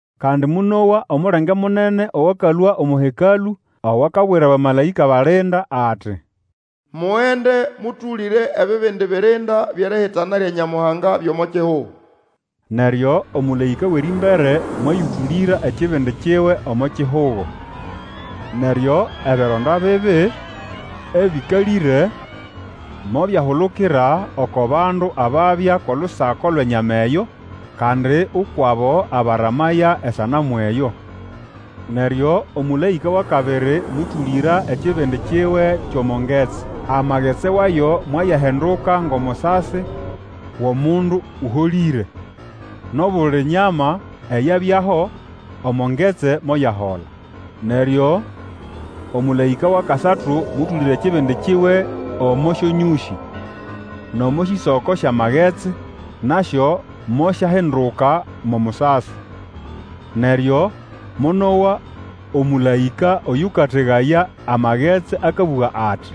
Kandi monowa omulenge munene owakalũa omo Hekalũ, owakabwira abamalaĩka balinda ati, Mugende, mũtũlĩre ebibindi birinda byʼerihitana lya Nyamuhanga byʼomo kihugo. Neryo omũlaĩka wʼerĩmbere mwayũtũlĩra ekibindi kiwe omo kihugo. Neryo ebironda bibi, ebĩkalĩre, mobyahulukira oko bandu ababya kʼolusako lwʼenyama eyo, kandi ukwʼabo abaramaya esanamu eyo. Neryo omũlaĩka wʼakabiri mũtũlĩra ekibindi kiwe kyʼomo ngetsi. Amagetsi wayo mwayahinduka ngʼomusasi wʼomundu ũholĩre, nʼobuli nyama eyabyaho omo ngetsi moyahola. Neryo omũlaĩka wʼakasatu mũtũlĩra ekibindi kiwe omo syonyũsĩ nʼomo sĩsoko syʼamagetsi, nasyo mosyahinduka mo musasi. Neryo monowa omũlaĩka oyũkategaya amagetsi akabũga ati,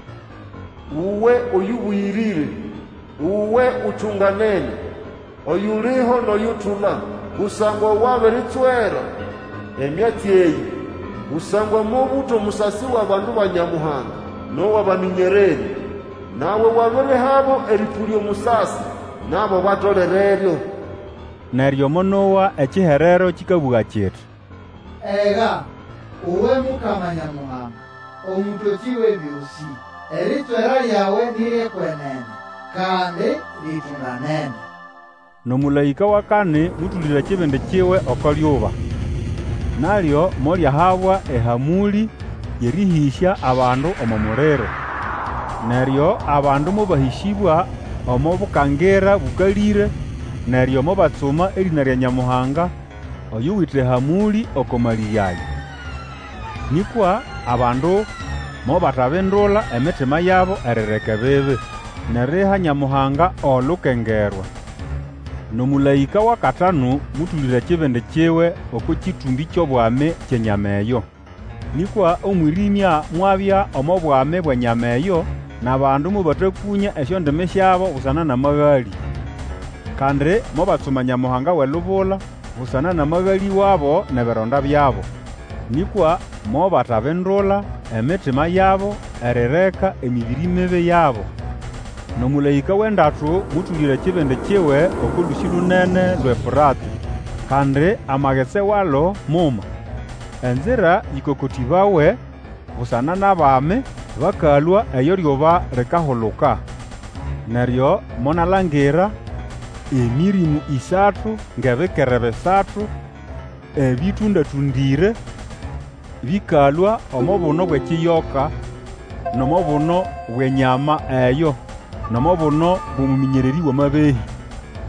Uwe Oyũbũyĩrĩre, uwe Utunganene, oyuliho nʼoyutula, kusangwa wabiritswera emyatsi eyĩ! Kusangwa mobũta omusasi wʼabandu ba Nyamuhanga nʼowʼabamĩnyererĩ, nawe wabirihabo erĩpũlya omusasi. Nabo batolereryo. Neryo monowa ekiherero kĩkabũga kiti, Ega, Uwe Mukama Nyamuhanga, Omũtokĩ Wʼebyosĩ! Eritswera lyawe ni ryʼekwenene, kandi litunganene! Nʼomũlaĩka wʼakani mũtũlĩra ekibindi kiwe oko lyuba, nalyo molyahabwa ehamũlĩ yʼerĩhĩsya abandu omo muliro. Neryo abandu mobahĩsĩbwa omo bukangira bũkalĩre, neryo mobatsuma erĩna lya Nyamuhanga oyuwite ehamũlĩ oko malĩge aya. Nĩkwa abandu mobatabindula emitima yabo erireka ebibi, nʼeriha Nyamuhanga olukengerwa. Nʼomũlaĩka wʼakatanu mũtũlĩra ekibindi kiwe oko kĩtũmbĩ kyʼobwami kyʼenyama eyo. Nĩkwa omwĩrĩmya mwabya omo bwami bwʼenyama eyo, nʼabandu mobatakũnya esyondimi syabo busana nʼamagalĩ. Kandi mobatsuma Nyamuhanga wʼelubula busana nʼamagalĩ wabo nʼebironda byabo. Nĩkwa mobatabindula emitima yabo erireka emĩbĩrĩ mibi yabo. Nʼomũlaĩka wʼendatu mũtũlĩra ekibindi kiwe oko lũsĩ lunene, lwʼeEfũratĩ. Kandi amagetsi walo muma, enzira ĩkokotĩbawe busana nʼabami bakalũa eyo eryuba likahuluka. Neryo monalangira emĩrĩmũ ĩsatu ngʼebikere bisatu ebĩtũnda-tũndĩre bĩkalũa omo buno bwʼekiyoka, nʼomo buno bwʼenyama eyo, nʼomo buno bwʼomũmĩnyererĩ wʼamabehĩ.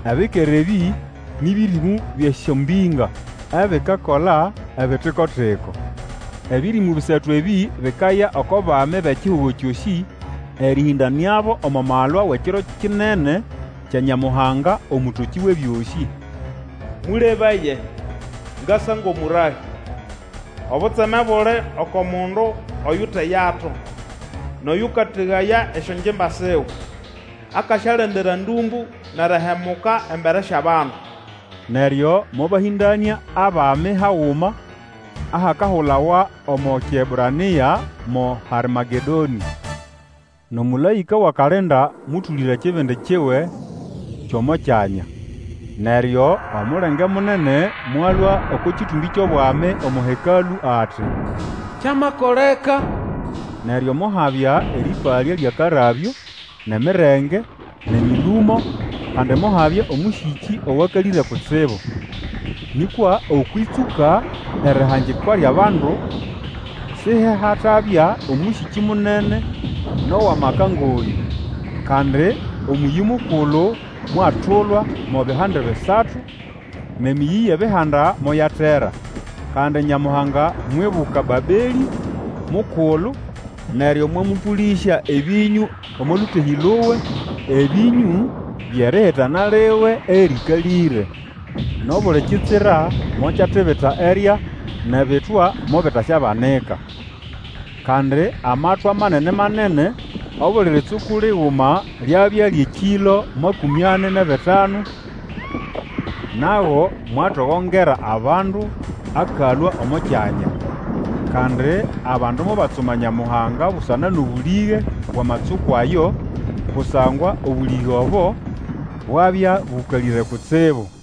Ebikere ebĩ, nĩ bĩrĩmũ byʼesyombĩnga ebikakola ebitiko-tiko. Ebĩrĩmũ bisatu ebĩ bikaya oko bami bʼekihugo kyosĩ, erĩhĩndanĩabo omo malwa wʼekiro kinene kya Nyamuhanga Omũtokĩ Wʼebyosĩ. Mũlebaye! Ngasa ngʼomũrahĩ. Obutseme buli oko mundu oyuteyato, nʼoyũkategaya esyongimba siwe, akasyalendera ndũmbũ nʼerihemuka embere syʼabandu. Neryo mobahĩndanĩa abami haguma ahakahulawa omo Kiebrania mo Harmagedonĩ. Nʼomũlaĩka wʼakalinda mũtũlĩra ekibindi kiwe kyʼomo kyanya, neryo omulenge munene mwalũa oko kĩtũmbĩ kyʼobwami omo Hekalũ ati, Kyamakoleka! Neryo mohabya erĩpalya lyʼakarabyo, nʼemirenge, nʼemĩlũmo, kandi mohabya omũsĩkĩ owakalĩre kutsibu. Nĩkwa okwʼĩtsũka erihangikwa lyʼabandu, sihehatabya omũsĩkĩ munene nʼowʼamaka ngʼoyũ. Kandi omũyĩ mukulu mwatulwa mo bihande bisatu, nʼemĩyĩ yʼebihanda moyatera. Kandi Nyamuhanga mwibuka Babelĩ mukulu, neryo mwamũpũlĩsya ebĩnyũ omo lũtehĩ luwe, ebĩnyũ byʼerihitana liwe erĩkalĩre. Nʼobuli kitsira mokyatibita erya, nʼebitwa mobitaswabanika. Kandi amatwa manene-manene, obuli ritsuku liguma lyabya lyʼekĩlo makũmĩ ani nʼebitanu, nago mwatogongera abandu akalũa omo kyanya. Kandi abandu mobatsuma Nyamuhanga busana nʼobũlĩge bwʼamatsuku ayo, kusangwa obũlĩge obo bwabya bũkalĩre kutsibu.